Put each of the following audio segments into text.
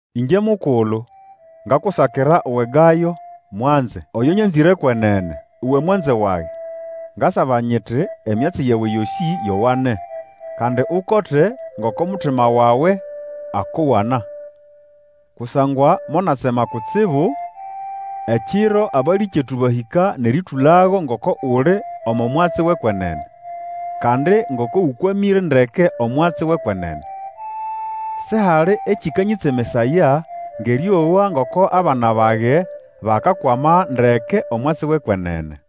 Ĩngye mukulu ngakusakira uwe Gayo mwanze, oyo nyanzĩre kwenene. Uwe mwanze wage, ngasaba nyiti, emyatsi yawe yosĩ yowane, kandi ukote ngoko mutima wawe akũwana. Kusangwa monatsema kutsibu ekiro abalĩkyetu bahĩka nʼerĩtũlago ngoko uli omo mwatsi wʼekwenene, kandi ngoko ũkwamĩre ndeke omwatsi wʼekwenene. Sihali ekĩkanyĩtsemesaya ngʼerĩowa ngoko abana bage bakakwama ndeke omwatsi wʼekwenene.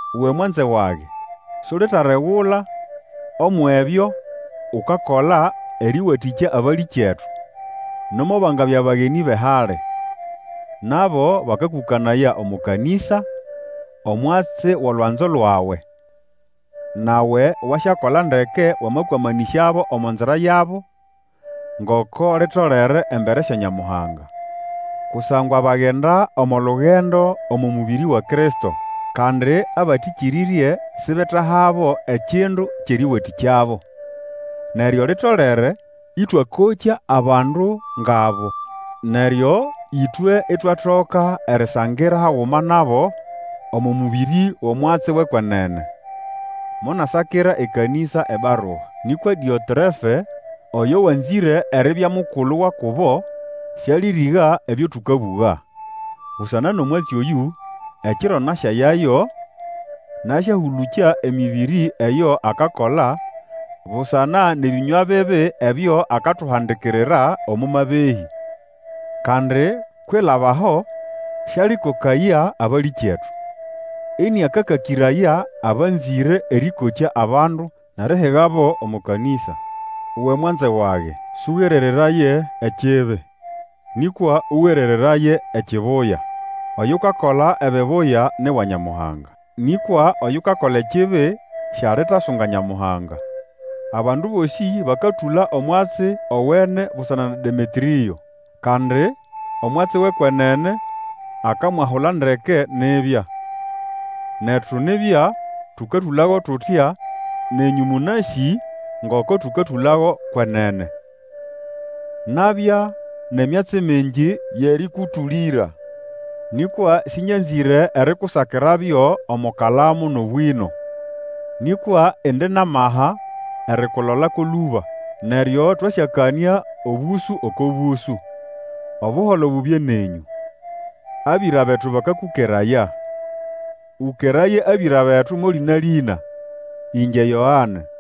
Uwe mwanze wage, Sulitalegula umwʼebyo ukakola erĩwatĩkya abalĩkyetu, nomo bangabya bagenĩ bʼehali. Nabo bakakũkanaya omo kanĩsa, omwatsi wʼolwanzo lwawe. Nawe wasyakola ndeke wamakwamanĩsyabo omo nzira yabo, ngoko litolere embere sya Nyamuhanga. Kusangwa bagenda omo lugendo omo mũbĩrĩ wa Kristo, kandi abatĩkĩrĩrye sibetahabo ekindu kyʼerĩwatĩkyabo. Neryo litolere ĩtwakokya abandu ngʼabo, neryo ĩtwe itwatoka erisangira haguma nabo omo mũbĩrĩ wʼomwatsi wʼekwenene. Monasakira ekanĩsa ebarua, nĩkwa Dĩotrefe, oyo wanzĩre eribya mukulu wa kubo, Sĩalĩrĩga ebyo tũkabũga. Busana nʼomwatsi oyũ, ekiro nasyayayo, nasyahũlũkya emĩbĩrĩ eyo akakola, busana nʼebĩnywa bibi ebyo akatuhandikirira, omo mabehĩ. Kandi kwilaba aho sĩalĩkokaya abalĩkyetu, ĩnĩakakakĩraya abanzĩre erĩkokya abandu, nʼerihigabo omo kanĩsa. Uwe mwanze wage, sũgerereraye ekibi, nĩkwa ũgerereraye ekibuya. Oyukakola ebibuya ni wa Nyamuhanga. Nĩkwa oyukakola ekibi sialitasunga Nyamuhanga. Abandu bosĩ bakatũla omwatsi owene busana na Demetrĩo. Kandi omwatsi wʼekwenene akamwahula ndeke nibya. Netu nibya tũkatũlago tutya, nenyũ mũnasĩ ngoko tũkatũlago kwenene. Nabya nʼemyatsi mingi yʼerĩkũtũlĩra, nĩkwa sĩnyanzĩre erikusakirabyo omo kalamu nʼobwĩno. Nĩkwa indi nʼamaha erikulolako lũba, neryo twasyakanĩa obũsũ oko bũsũ. Obuholo bubye nenyũ. Abĩra betu bakakũkeraya. Ũkeraye abĩra betu mo lĩna-lĩna. Ĩngye YOANE.